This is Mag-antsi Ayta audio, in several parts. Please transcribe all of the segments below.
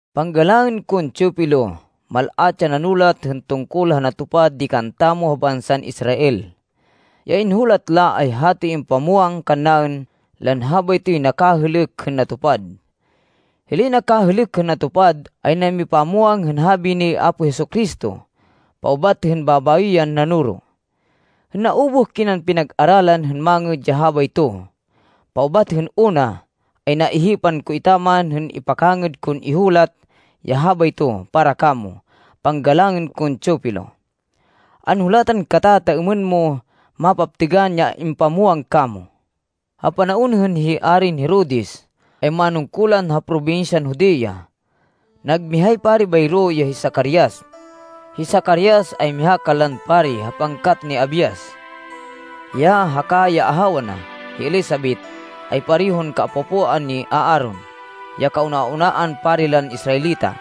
Panggalangên kon Teofilo, Mal-at ya nanulat hên tungkol ha natupad di kantamo ha bansan Israel. Ya inhulat la ay hatoy impamwang kannaên lan habaytoy nakahêlêk hên natupad. Hilay nakahêlêk hên natupad, ay namipamwang hên habi ni Apo Jesu-Cristo paubat hên babayo yan nanoro. Hên naubuh kinan pinag-aralan hên mangêd ya habayto, paubat hên una, ay naihipan ko etaman hên ipakangêd kon ihulat ya habayto para kamo, panggalangên kon Teofilo. Anhulatan kata ta êmên mo mapaptêgan ya impamwang kamo. Ha panaon hên hi Arin Herodes ay manungkulan ha probinsyan Judea, nag mihay pari bayro, ya hi Zacarias. Hi Zacarias, ay miha kanlan pari ha pangkat ni Abias. Hiya haka ya ahawa na, hi Elisabet, ay parehon kaapo-apoan ni Aaron, ya kauna-unaan pari lan Israelita.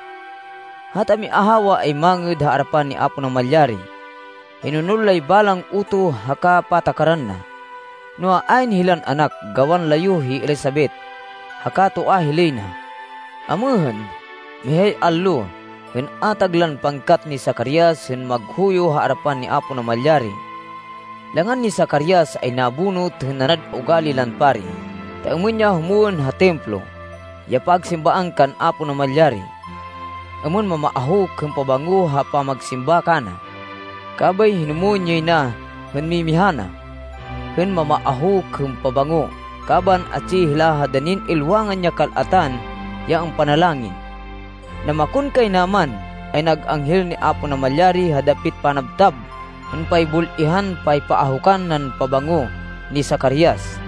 Hata miahawa ay mangêd ha arapan ni Apo Namalyari. Hinonol lay balang utoh haka patakaran na. Noa, ayn hilan anak gawan layuh hi Elisabet, haka toa hilay na. Amêhên, mihay allo, hên atag lan pangkat ni Zacarias hên maghuyo ha arapan ni Apo Namalyari, langan ni Zacarias ay nabonut hên nanad ugali lan pari, ta êmên ya humwên ha Templo, ya pagsimbaan kan Apo Namalyari, êmên mamaahuk hên pabango ha pamagsimba kana. Kabay hinumwên yay na hên mimiha na hên mamaahuk hên pabango, kaban atsi hila ha danin ilwangan ya kal-atan ya ampanalangin. Namakonkaynaman, ay nag anghel ni Apo Namalyari ha dapit panabtab hên paybul-ihan paypaahukan nan pabango ni Zacarias.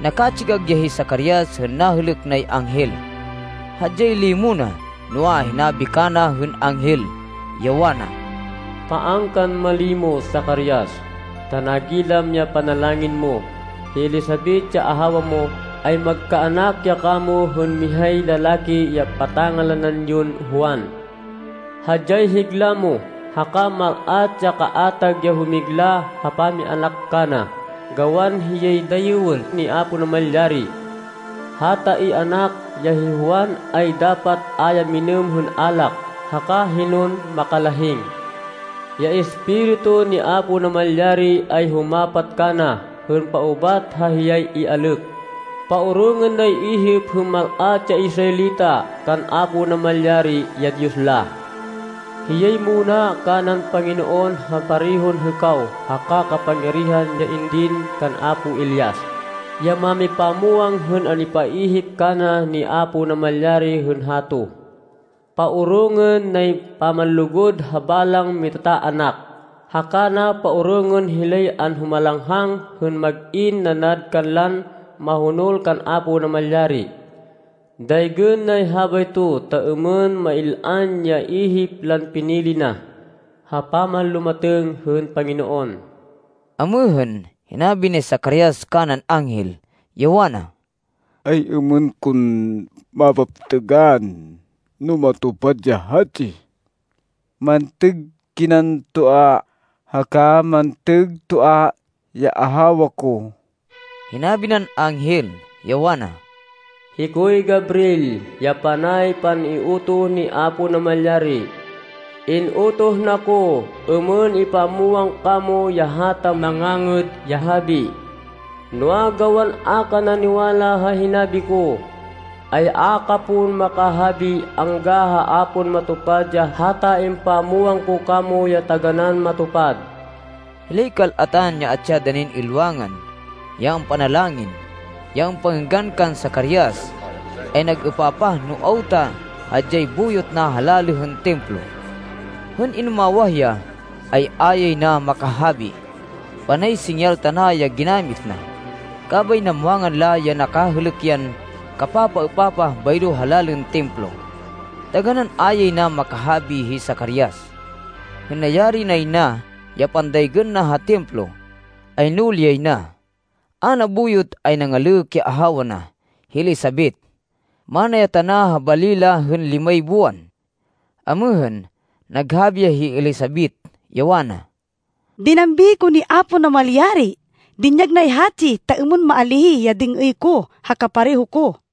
Nakatsigag ya hi Zacarias hên nahêlêk nay anghel. Hadyay limo na. Noa, hinabi kana hên anghel, ya wana, “Paan kan malimo, Zacarias, ta nagilam ya panalangin mo. Hi Elisabet, ya ahawa mo, ay magkaanak ya kamo hên mihay lalaki ya pata-ngalanan yon Juan. Hadyay higla mo. Haka mal-at ya kaatag ya humigla ha pamianak kana, gawan hiyay dayêwên ni Apo Namalyari. Hata ianak, ya hi Juan, ay dapat a ya minêm hên alak, haka hinon makalahing. Ya Espiritu ni Apo Namalyari ay humapat kana hên paubat ha hiyay ialêk. Paorongên nay ihip hên mal-at ya Israelita kan Apo Namalyari, ya Diyos la. Hiyay muna kanan Panginoon ha parehon hêkaw haka kapangyarihan ya indin kan apo Elias, ya mámipamwang hên impaihip kana ni Apo Namalyari hên hato. Paorongên nay pamanlugud ha balang mitataanak, haka na paorongên hilay anhumalanghang hên mag-in nanad kanlan mahonol kan Apo Namalyari. Daygên nay habayto ta êmên mail-an ya ihip lan pinili na, ha pamanlumatêng hên Panginoon.” Amêhên, hinabi ni Zacarias kanan anghel, ya wana, “Ay-êmên kon mapaptêgan no matupad ya hatsi? Mantêg kinan toa haka mantêg toa ya ahawa ko.” Hinabi nan anghel, ya wana, “Hikoy Gabriel ya panay pan-iutoh ni Apo Namalyari. In-utoh na ko êmên ipamwang kamo ya hata mangangêd ya habi. Noa, gawan a ka naniwala ha hinabi ko, ay a ka pon makahabi angga ha a pon matupad ya hata impamwang ko kamo ya taganán matupad.” Hilay kal-atan ya atsi ha danin ilwangan, ya ampanalangin, ya ampangênggan kan Zacarias, ay nag-êpapah no awta hadyay buyot na ha lalê hên Templo. Hên inumawah ya, ay a yay na makahabi. Panay singyal tana ya ginamit na. Kabay namwangan la ya nakahêlêk yan kapapaêpapah bayro ha lalên Templo. Taganán a yay na makahabi hi Zacarias. Hên nayari nay na ya pandaygên na ha Templo, ay nuli yay na. A nabuyot ay nangalêk ya ahawa na, hi Elisabet. Mana ya tana ha bali la hên limay buwan. Amêhên, naghabi ya hi Elisabet, ya wana, “Dinambi ko ni Apo Namalyari. Dinyag nay hatsi ta êmên maalíh ya dêng-êy ko ha kapareho ko.”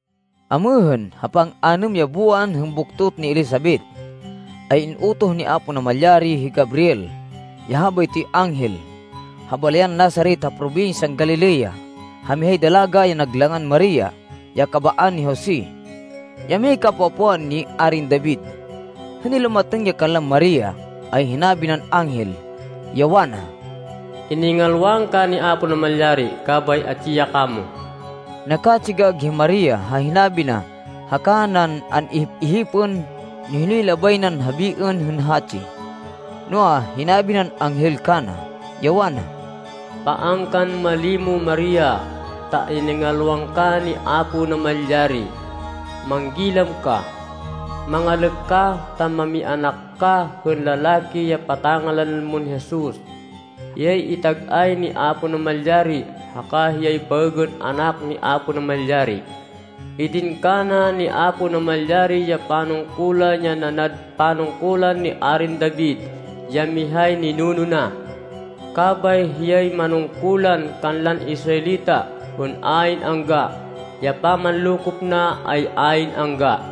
Amêhên, ha pang-anêm ya buwan hên buktot ni Elisabet, ay in-utoh ni Apo Namalyari hi Gabriel, ya habaytoy anghel, ha balayan Nazaret ha probinsyan Galilea ha mihay dalaga ya nag langan Maria, ya kabaan ni Jose, ya mihay kaapo-apoan ni Arin David. Hên nilumatêng ya kanlan Maria, ay hinabi nan anghel, ya wana, “Iningalwan ka ni Apo Namalyari kabay atsi ya kamo.” Nakatsigag hi Maria ha hinabi na haka nan an-ihip-ihipên no hinoy labay nan habiên hên hatsi. Noa, hinabi nan anghel kana, ya wana, “Paan kan malimo Maria, ta iningalwan ka ni Apo Namalyari. Manggilam ka! Mangalêk ka ta mamianak ka hên lalaki ya pata-ngalanan mon Jesus. Hiyay itag-ay ni Apo Namalyari haka hiyay baêgên Anak ni Apo Namalyari. Idin kana ni Apo Namalyari ya panungkulan ya nanad panungkulan ni Arin David, ya mihay ninuno na. Kabay hiyay manungkulan kanlan Israelita hên ayn angga. Ya pamanlokop na ay ayn angga.”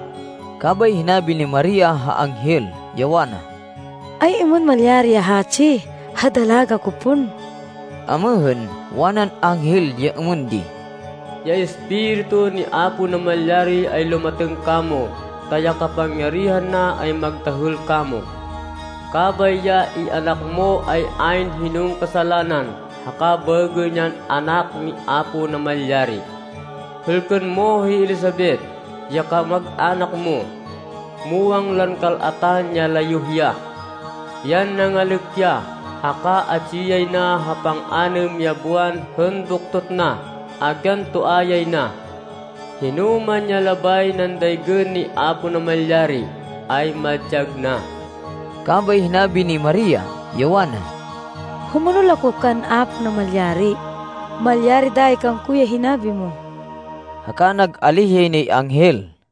Kabay hinabi ni Maria ha anghel, ya wana, “Ay-êmên malyari ya hatsi, ha dalaga ko pon?” Amêhên, wanan anghel ya êmên di, “Ya Espiritu ni Apo Namalyari ay lumatêng kamo ta ya kapangyarihan na ay magdahêl kamo. Kabay ya ianak mo ay ayn hinon kasalanan haka baêgên yan Anak ni Apo Namalyari. Hêlkên mo hi Elisabet, ya kamag-anak mo. Muwang lan kal-atan ya layuh ya. Yan nangalêk ya, haka atsi yay na ha pang-anêm ya buwan hên buktot na, agyan toa yay na. Hinoman ya labay nan daygên ni Apo Namalyari, ay madyag na.” Kabay hinabi ni Maria, ya wana, “Humonol ako kan Apo Namalyari. Malyari dayi kangko ya hinabi mo.” Haka nag-alíh yay nay anghel.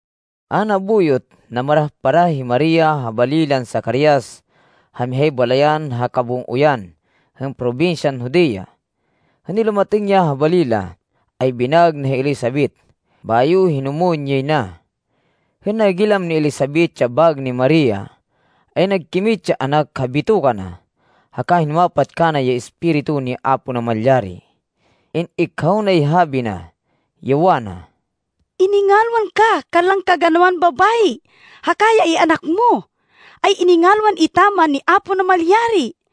A nabuyot, namarah-parah hi Maria ha bali lan Zacarias ha mihay balayan ha kabung-oyan hên probinsyan Judea. Hên nilumatêng ya ha bali la, ay binaêg na hi Elisabet, bayo hinumwên yay na. Hên nagilam ni Elisabet ya baêg ni Maria, ay nagkimit ya anak ha bitoka na haka hinumapat kana ya Espiritu ni Apo Namalyari. In-ikhaw nay habi na, ya wana, “Iningalwan ka kanlan kaganawan babayi haka ya ianak mo, ay iningalwan etaman ni Apo Namalyari.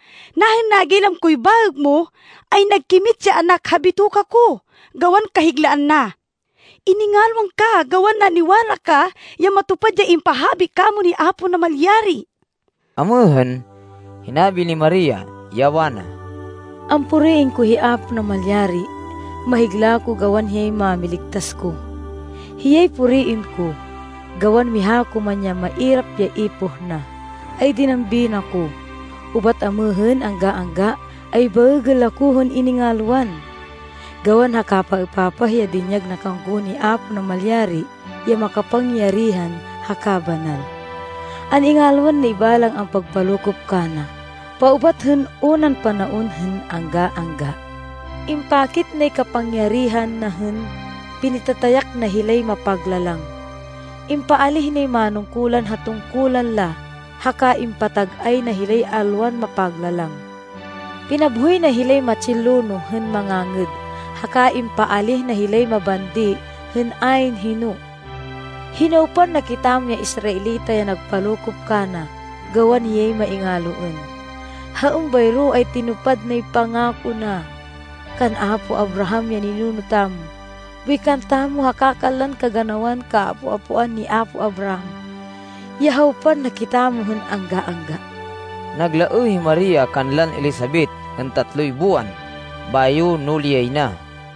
Nahên nagilam koy baêg mo, ay nagkimit ya anak ha bitoka ko, gawan kahiglaan na. Iningalwan ka gawan naniwala ka ya matupad ya impahabi kamo ni Apo Namalyari.” Amêhên, hinabi ni Maria, ya wana, “Ampuriên ko hi Apo Namalyari. Mahigla ko gawan hiyay Mámiligtas ko. Hiyay puriên ko, gawan miha ko man ya mairap ya ipoh na, ay dinambi na ko. Ubat amêhên angga-angga, ay baêgên la ko hên iningalwan, gawan ha kapapaêpapah ya dinyag na kangko ni Apo Namalyari ya makapangyarihan haka banal. An-ingalwan nay balang ampagpalokop kana, paubat hên unan panaon hên angga-angga. Impakit nay kapangyarihan na hên pinitatayak na hilay mapaglalang. Impaalíh nay manungkulan ha tungkulan la haka impatag-ay na hilay alwan mapaglalang. Pinabhoy na hilay matsin lonoh hên mangangêd, haka impaalíh na hilay mabandi hên ayn hino. Hinawpan na kitamo ya Israelita ya nagpalokop kana gawan hiyay maingaloên. Ha êmbayro ay tinupad nay pangako na Kan apo Abraham, ya ninuno tamo, boy kantamo haka kanlan kaganawan kaapo-apoan ni apo Abraham ya hawpan na kitamo hên angga-angga!” Naglaêh hi Maria kanlan Elisabet hên tatloy buwan bayo nuli yay na.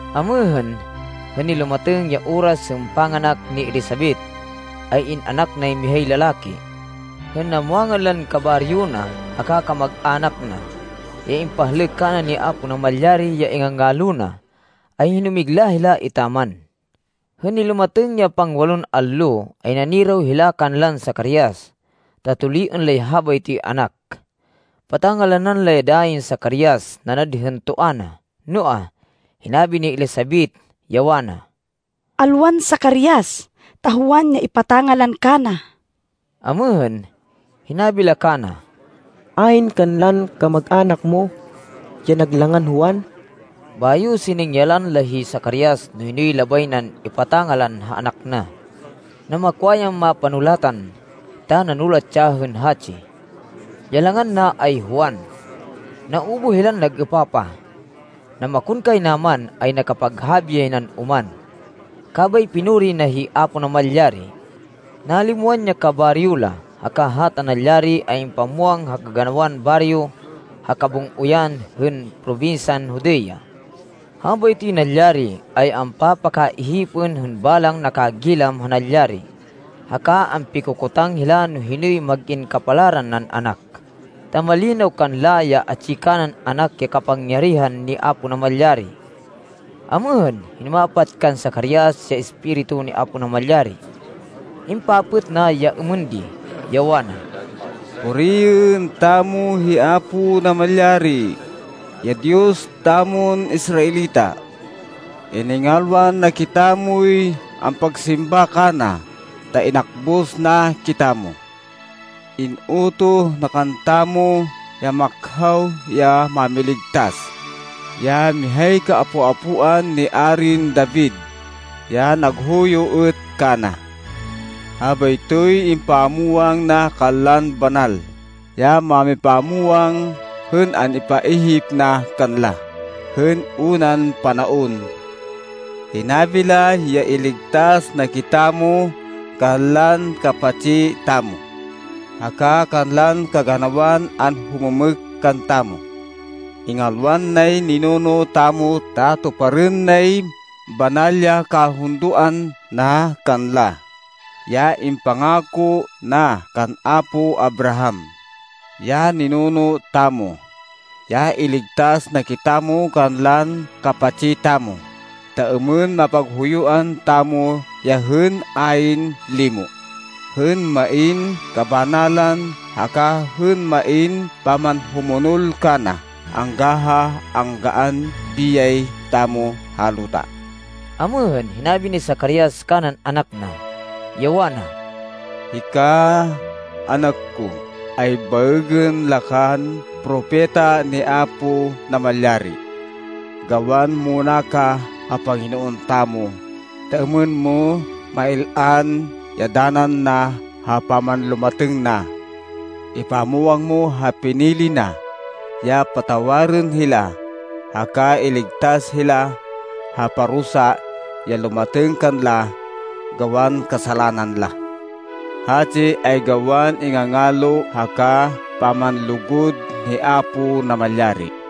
Amêhên, hên nilumatêng ya oras hên panganak ni Elisabet ay in-anak nay mihay lalaki. Hên namwangan lan kabaryo na haka kamag-anak na, ya impahlêk kana ni Apo Namalyari ya ingangalo na, ay hinumigla hila etaman. Hên nilumatêng ya pangwalon allo ay naniraw hila kanlan Zacarias, ta tuliên lay habaytoy anak. Pata-ngalanan la ya dayin Zacarias nanad hên toa na. Noa, hinabi ni Elisabet, ya wana, “Alwan Zacarias, ta Juan ya ipata-ngalan kana.” Amêhên, hinabi la kana, “Ayn kanlan kamag-anak mo ya nag langan Juan.” Bayo siningyalan la hi Zacarias no hinoy labay nan ipata-ngalan ha anak na. Namakwa yan mapanulatan ta nanulat ya hên hatsi, “Ya langan na ay Juan.” Naubuh hilan nag-êpapah. Namakonkaynaman ay nakapaghabi yay nan oman, kabay pinuri na hi Apo Namalyari! Nalimwan ya kabaryo la, haka hata nalyari ay impamwang ha kaganawan baryo ha kabung-oyan hên probinsyan Judea. Habaytoy nalyari ay ampapakaihipên hên balang nakagilam ha nalyari, haka ampikokotang hila no hinoy mag-in kapalaran nan anak, ta malinaw kanla ya atsi kanan anak ya kapangyarihan ni Apo Namalyari. Amêhên, hinumapat kan Zacarias ya Espiritu ni Apo Namalyari. Impapêt na ya êmên di, ya wana, “Puriên tamo hi Apo Namalyari, ya Diyos tamon Israelita. Iningalwan na kitamoy ampagsimba kana ta inakbus na kitamo. In-utoh na kantamo ya makhaw ya Mámiligtas, ya mihay kaapo-apoan ni Arin David, ya naghuyo êt kana. Habaytoy impamwang na kanlan banal ya mámipamwang hên an-ipaihip na kanla hên unan panaon. Hinabi la ya iligtas na kitamo kanlan kapatsi tamo, haka kanlan kaganawan anhumêmêk kantamo. Ingalwan nay ninuno tamo ta tuparên nay banal ya kahundoan na kanla, ya impangako na kan apo Abraham, ya ninuno tamo, ya iligtas na kitamo kanlan kapatsi tamo ta êmên mapaghuyuan tamo ya hên ayn limo, hên main kabanalan, haka hên main pamanhumonol kana angga ha anggaan biyay tamo ha luta.” Amêhên, hinabi ni Zacarias kanan anak na, ya wana, “Hika, anak ko ay baêgên la kan propeta ni Apo Namalyari gawan muna ka ha Panginoon tamo ta êmên mo mail-an ya danan na ha pamanlumatêng na. Ipamwang mo ha pinili na, ya patawarên hila haka iligtas hila ha parusa ya lumatêng kanla gawan kasalanan la. Hatsi ay gawan ingangalo haka pamanlugud ni Apo Namalyari,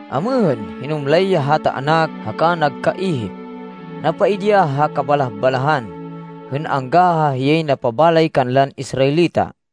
Amêhên, hinumlay ya hata anak haka nagkaihip. Napaidi ya ha kabalah-balahan, hên angga ha hiyay napabalay kanlan Israelita.